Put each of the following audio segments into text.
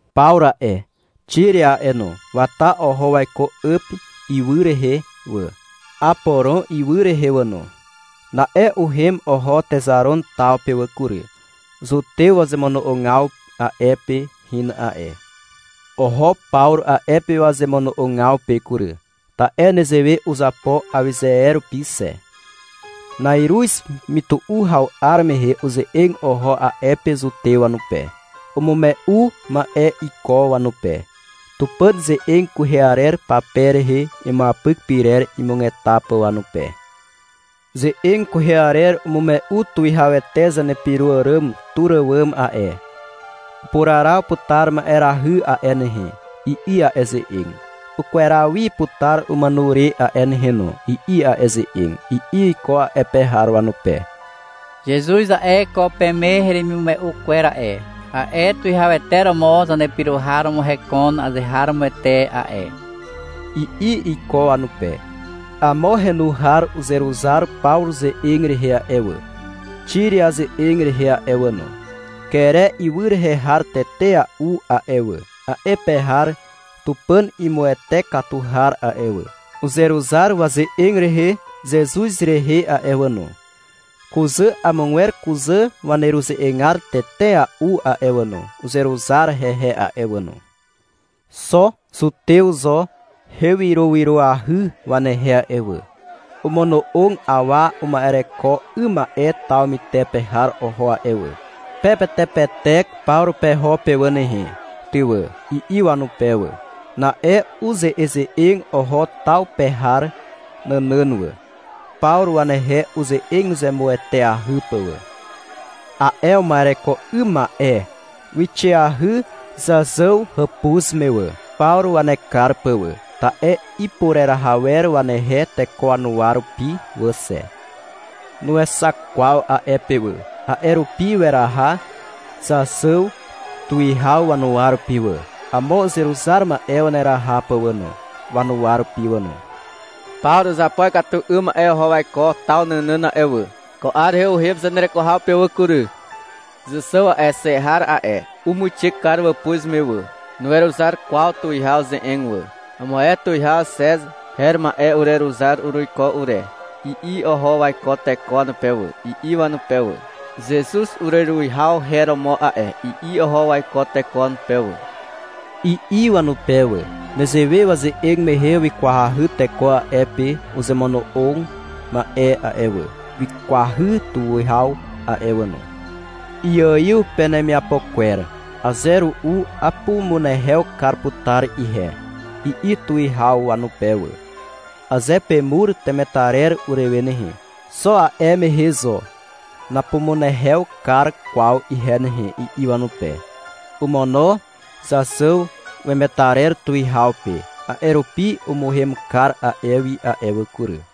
Pawru a'e, Xiria a'e no, wata oho waiko Àpi ywy rehe wà, Aporon ywy rehe wà no. Na'e uhem oho Texaron taw pe wà kury. Zutew wazemono'ogaw a'e pe hin a'e. Oho Pawru a'e pe wazemono'ogaw pe kury, ta'e nezewe uzapo awyze e rupi xe. Na'iruz mytu'u haw 'ar mehe uze'eg oho a'e pe zutew wanupe. Umume'u ma'e iko wanupe, Tupàn ze'eg kwehe arer pape rehe imuapyk pyrer imugeta pà wanupe. — Ze'eg kwehe arer umume'u tuwihawete zanepyro àràm tur àwàm a'e. — Upuraraw putar ma'erahy a'e nehe, i'i a'e ze'eg. — Ukweraw wi putar umàno re a'e nehe no, i'i a'e ze'eg, i'i iko a'e pe har wanupe. -Zezuz a'e, ko peme heremimume'u kwer a'e, a'e tuwihawete romo zanepyro har romo hekon azeharomoete a'e, i'i iko wanupe. Amo henu har uzeruzar Pawru ze'eg rehe a'e wà, Xiria ze'eg rehe a'e wà no. Kere ywy rehe har tetea'u a'e wà, a'e pe har Tupàn imuwete katu har a'e wà, uzeruzar waze'eg rehe Zezuz rehe a'e wà no. Kuzà amogwer kuzà waneruze'egar tetea'u a'e wà no, uzeruzar hehe a'e wà no. Xo zutew zo hewyrowyroahy wanehe a'e wà. Omono'og awa uma'ereko 'ym ma'e taw mytepe har oho a'e wà. — Pepetepetek Pawru peho pe wà nehe, ty wà, i'i wanupe wà. Na'e uze'eze'eg oho taw pe har nànàn wà, Pawru wanehe uze'eg zemueteahy pà wà. A'e uma'ereko 'ym ma'e, wixeahy Zàxàw hàpuz me wà, Pawru wanekar pà wà, ta'e ipureraha wer wanehe teko wanuwa rupi wà xe. Nuexak kwaw a'e pe wà. A'e rupi weraha Zàxàw tuwihaw wanuwa rupi wà, amo uzeruzar ma'e waneraha pà wà no, wanuwa rupi wà no. -Pawru uzapo ikatu 'ym ma'e oho waiko taw nànàn a'e wà. Ko 'ar rehe uhem zanereko haw pe wà kury. Zàxàw a'e, xe har a'e, umuixe kar wàpuz me wà. Nuweruzar kwaw tuwihaw ze'eg wà. — Amo ae tuwihaw Xez her ma'e ureruzar uruiko ure, i'i oho waiko teko wanupe wà, i'i wanupe wà. — Zezuz ureruwihaw her romo a'e, i'i oho waiko teko wanupe wà, i'i wanupe wà. Nezewe waze'eg mehe wikwahy teko a'e pe uzemono'og ma'e a'e wà. Wikwahy tuwihaw a'e wà no. — Iaiw penemiapo kwer. Aze ru'u apumunehew kar putar ihe, i'i tuwihaw wanupe wà. — Aze pemur temetarer urewe nehe, xo a'e mehe zo napumunehew kar kwaw ihe nehe, i'i wanupe. Omono Zàxàw wemetarer tuwihaw pe. A'e rupi umuhem kar a'e wi a'e wà kury.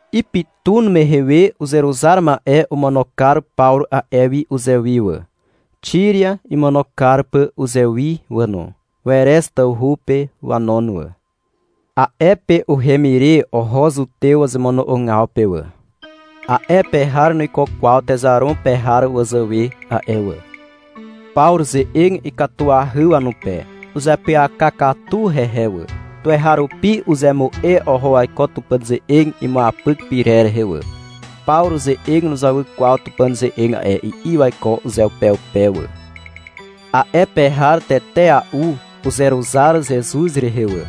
Ipytun mehe we uzeruzar ma'e omono kar Pawru a'e wi uzewi wà, Xiria imono kar pà uzewi wà no. Werez tawhu pe wanon wà. A'e pe uhem ire oho zutew wazemono'ogaw pe wà. A'e pe har nuiko kwaw Texaron pe har wazàwe a'e wà. Pawru ze'eg ikatuahy wanupe. Uzeapyaka katu hehe wà. Tuweharupi uzemu'e oho waiko Tupàn ze'eg imuapyk pyrer rehe wà. — Pawru ze'eg nuzawy kwaw Tupàn ze'eg a'e, i'i waiko uzeupeupe wà. A'e pe har tetea'u uzeruzar Zezuz rehe wà.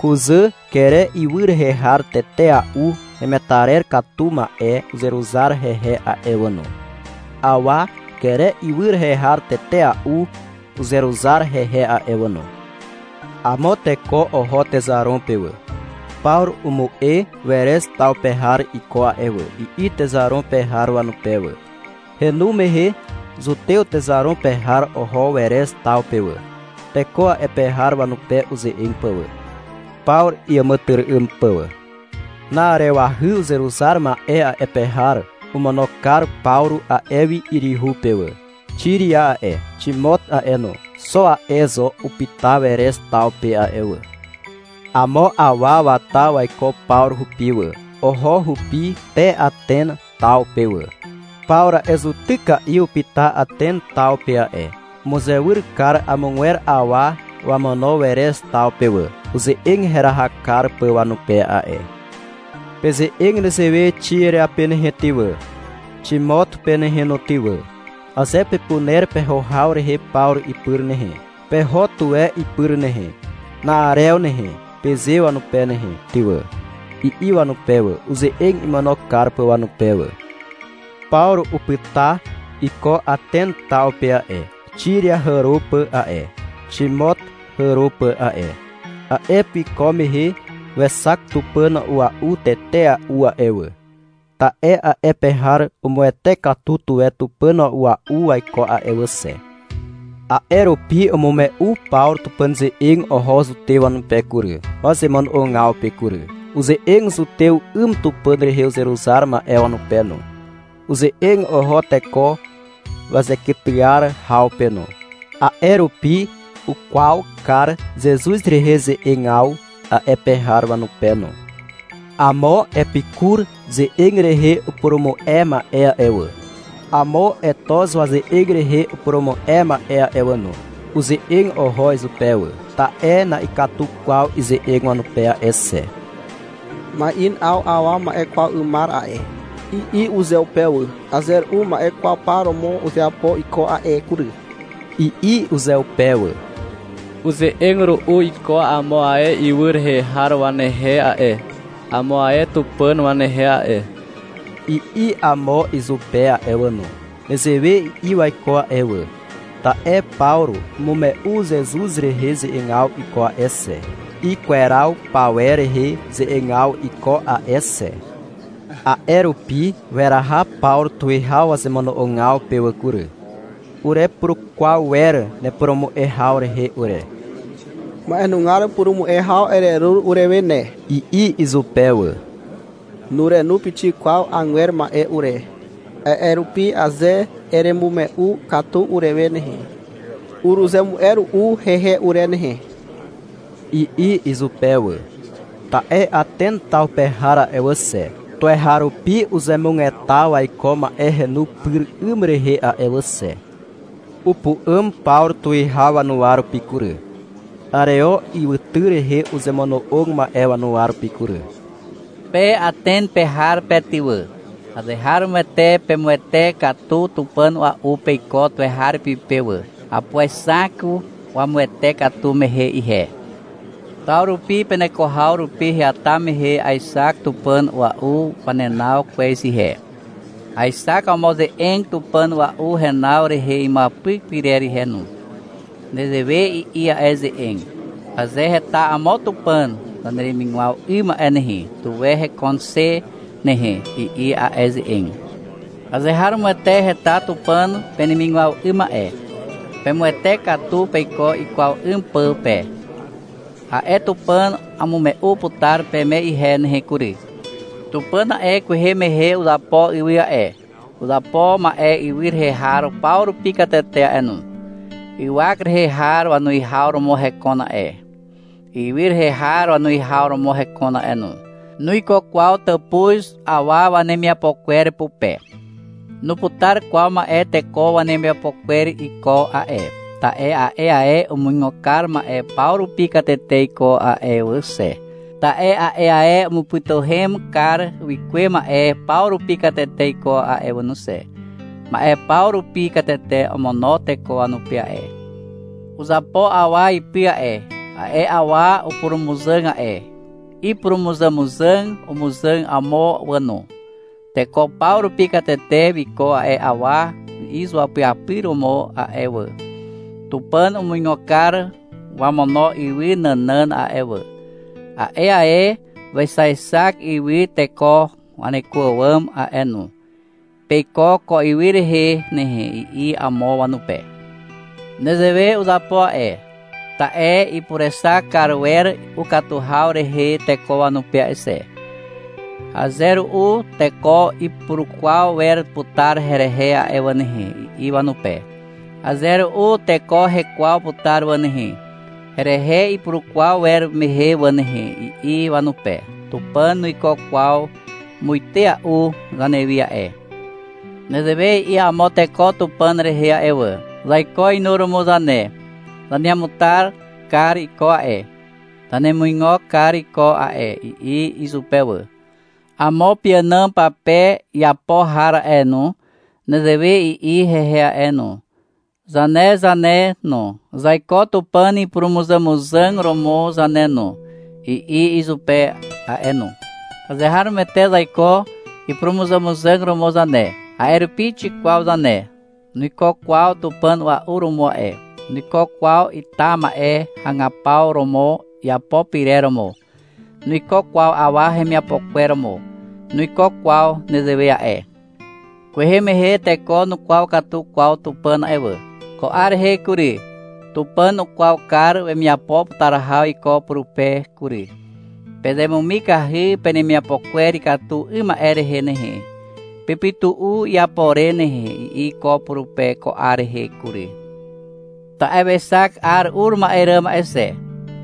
Kuzà Kere ywy rehe har tetea'u hemetarer katu ma'e uzeruzar hehe a'e wà no. Awa Kere ywy rehe har tetea'u uzeruzar hehe a'e wà no. Amo teko oho Texaron pe wà. — Pawru umu'e Werez taw pe har iko a'e wà, i'i Texaron pe har wanupe wà. Henu mehe zutew Texaron pe har oho Werez taw pe wà, teko a'e pe har wanupe uze'eg pà wà, Pawru iàmàtyry'ym pà wà. Na'arewahy uzeruzar ma'e a'e pe har omono kar Pawru a'e wi yryhu pe wà. Xiria a'e, Ximot a'e no, xo a'e zo upyta Werez taw pe a'e wà. Amo awa wata waiko Pawru hupi wà. Oho hupi te Aten taw pe wà. Pawru a'e zutyka'i upyta Aten taw pe a'e. Umuzewyr kar amogwer awa wamono Werez taw pe wà, uze'eg heraha kar pà wanupe a'e. — Peze'eg nezewe Xiria pe nehe ty wà, Ximot pe nehe no ty wà. — Aze pepuner peho haw rehe Pawru ipyr nehe, peho tuwe ipyr nehe, na'arew nehe, peze wanupe nehe ty wà, i'i wanupe wà, uze'eg imono kar pà wanupe wà. Pawru upyta iko Aten taw pe a'e, Xiria hàro pà a'e, Ximot hàro pà a'e. A'e pe wiko mehe wexak tupàn a'ua'u tetea'u a'e wà, ta'e a'e pe har umuwete katu tuwe tupàn a'ua'u waiko a'e wà xe. A'e rupi umume'u Pawru Tupàn ze'eg oho zutew wanupe kury, wazemono'ogaw pe kury. Uze'eg zutew 'ym Tupàn rehe uzeruzar ma'e wanupe no. Uze'eg oho teko wazekytyar haw pe no, a'e rupi ukwaw kar Zezuz rehe ze'egaw a'e pe har wanupe no. Amo Epikur ze'eg rehe upurumu'e ma'e a'e wà, amo Etoz waze'eg rehe upurumu'e ma'e a'e wà no, uze'eg oho izupe wà, ta'e na'ikatu kwaw ize'eg wanupe a'e xe. -Ma'in 'aw awa ma'e kwaw 'ymar a'e, i'i uzeupe wà. — Aze ru'u ma'e kwaw par romo uzeapo iko a'e kury, i'i uzeupe wà. — Uze'eg ru'u iko amo ae ywy rehe har wanehe a'e, amo ae tupàn wanehe a'e, i'i amo izupe a'e wà no. Nezewe i'i waiko a'e wà, ta'e Pawru umume'u Zezuz rehe ze'egaw iko a'e xe, ikweraw pawer rehe ze'egaw iko a'e xe. A'e rupi weraha Pawru tuwihaw wazemono'ogaw pe wà kury. — Urepurukwaw wer nepurumu'e haw rehe ure. Ma'enugar purumu'e haw ererur urewe ne, i'i izupe wà. — Nurenu pixik kwaw agwer ma'e ure, a'e rupi aze eremume'u katu urewe nehe, uruzemu'e ru'u hehe ure nehe, i'i izupe wà. (Ta'e Aten taw pe har a'e wà xe, tuweharupi uzemugeta waiko ma'e henu pyr 'ym rehe a'e wà xe.) Upu'àm Pawru tuwihaw wanuwa rupi kury, Areo ywytyr rehe uzemono'og ma'e wanuwa rupi kury. -Pe Aten pe har pe ty wà, azeharomoete pemuwete katu tupàn a'ua'u peiko tuweharupi pe wà. Apuexak wamuwete katu mehe ihe. Taw rupi peneko haw rupi heata mehe aexak tupàn a'ua'u wanenaw kwez ihe. Aexak amo ze'eg tupàn a'ua'u henaw rehe imuapyk pyrer ihe no. Nezewe i'i a'e ze'eg. — Aze heta amo Tupàn zaneremigwaw 'ym a'e nehe, tuwe hekon xe a'e nehe, i'i a'e ze'eg, — Azeharomoete heta Tupàn penemigwaw 'ym a'e. Pemuwete katu peiko ikwaw 'ym pà pe. A'e Tupàn amume'u putar peme ihe nehe kury. — Tupàn a'e, kwehe mehe uzapo ywy a'e, uzapo ma'e ywy rehe har paw rupi katete a'e no. Ywak rehe har wanuwihaw romo hekon a'e. Ywy rehe har wanuwihaw romo hekon a'e no. Nuiko kwaw tàpuz awa wanemiapo kwer pupe. Nuputar kwaw ma'e teko wanemiapo kwer iko a'e, ta'e a'e ae umuigo kar ma'e paw rupi katete iko a'e wà xe, ta'e a'e ae umupytuhem kar wikuwe ma'e paw rupi katete iko a'e wà no xe. Ma'e paw rupi katete omono teko wanupe a'e. Uzapo awa ipy a'e. A'e awa upurumuzàg a'e. Ipurumuzàmuzàg umuzàg amo wà no. Teko paw rupi katete wiko a'e awa izuapyapyr romo a'e wà. Tupàn umuigo kar wamono ywy nànàn a'e wà. A'e ae wexaexak ywy teko waneko àwàm a'e no. Peiko ko ywy rehe nehe, i'i amo wanupe. Nezewe uzapo a'e, ta'e ipurexak kar wer ukatu haw rehe teko wanupe a'e xe. -Aze ru'u teko ipurukwaw wer putar herehe a'e wà nehe, i'i wanupe. -Aze ru'u teko hekwaw putar wà nehe, Herehe ipurukwaw wer mehe wà nehe, i'i wanupe. Tupàn nuiko kwaw muitea'u zanewi a'e. Nezewe i'i amo teko Tupàn rehe a'e wà. — Zaiko inuromo zane, zanemuata kar iko a'e, zanemuigo kar iko a'e, i'i izupe wà. Amo peànàm pape iapo har a'e no, nezewe i'i hehe a'e no. — Zane zane no, zaiko Tupàn ipurumuzàmuzàg romo zane no, i'i izupe a'e no. Azeharomoete zaiko ipurumuzàmuzàg romo zane. A'e rupi xikwaw zane. Nuiko kwaw tupàn a'ua'u romo a'e, nuiko kwaw ita ma'e hagapaw romo iapo pyrer romo. Nuiko kwaw awa hemiapo kwer romo. Nuiko kwaw nezewe a'e. Kwehe mehe teko nukwaw katu kwaw Tupàn a'e wà. Ko 'ar rehe kury, Tupàn ukwaw kar wemiapo putar haw iko purupe kury. -Pezemumikahy penemiapo kwer ikatu 'ym ma'e rehe nehe, pepytu'u iapo re nehe, i'i iko purupe ko 'ar rehe kury. Ta'e wexak 'ar ur ma'e ràm a'e xe.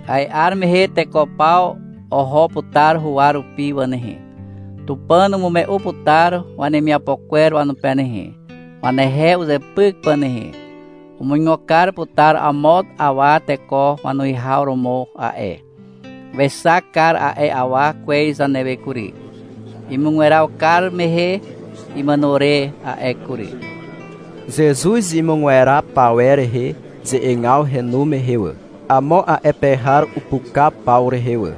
A'e 'ar mehe teko paw oho putar huwa rupi wà nehe. Tupàn umume'u putar wanemiapo kwer wanupe nehe, wanehe uzepyk pà nehe. Umuigo kar putar amo awa teko wanuwihaw romo a'e. Wexak kar a'e awa kwez zanewe kury, imugweraw kar mehe imàno re a'e kury. Zezuz imugweraw pawer rehe ze'egaw henu mehe wà, amo a'e pe har upuka Pawru rehe wà.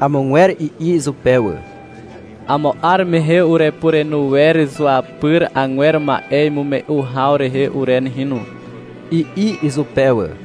Amogwer i'i izupe wà. — Amo 'ar mehe urepurenu wer zuapyri agwer ma'e imume'u haw rehe ure nehe no, i'i izupe wà.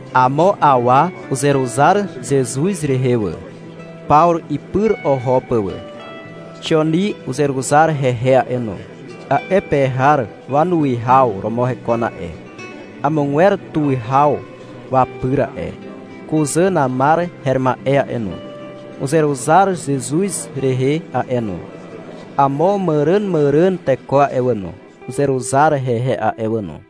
Amo awa uzeruzar Zezuz rehe wà, Pawru ipyr oho pà wà. Xioni uzeruzar hehe a'e no. A'e pe har wanuwihaw romo hekon a'e, amogwer tuwihaw wapyr a'e. Kuzà Namar her ma'e a'e no, uzeruzar Zezuz rehe a'e no. Amo màràmàràn teko a'e wà no, uzeruzar hehe a'e wà no.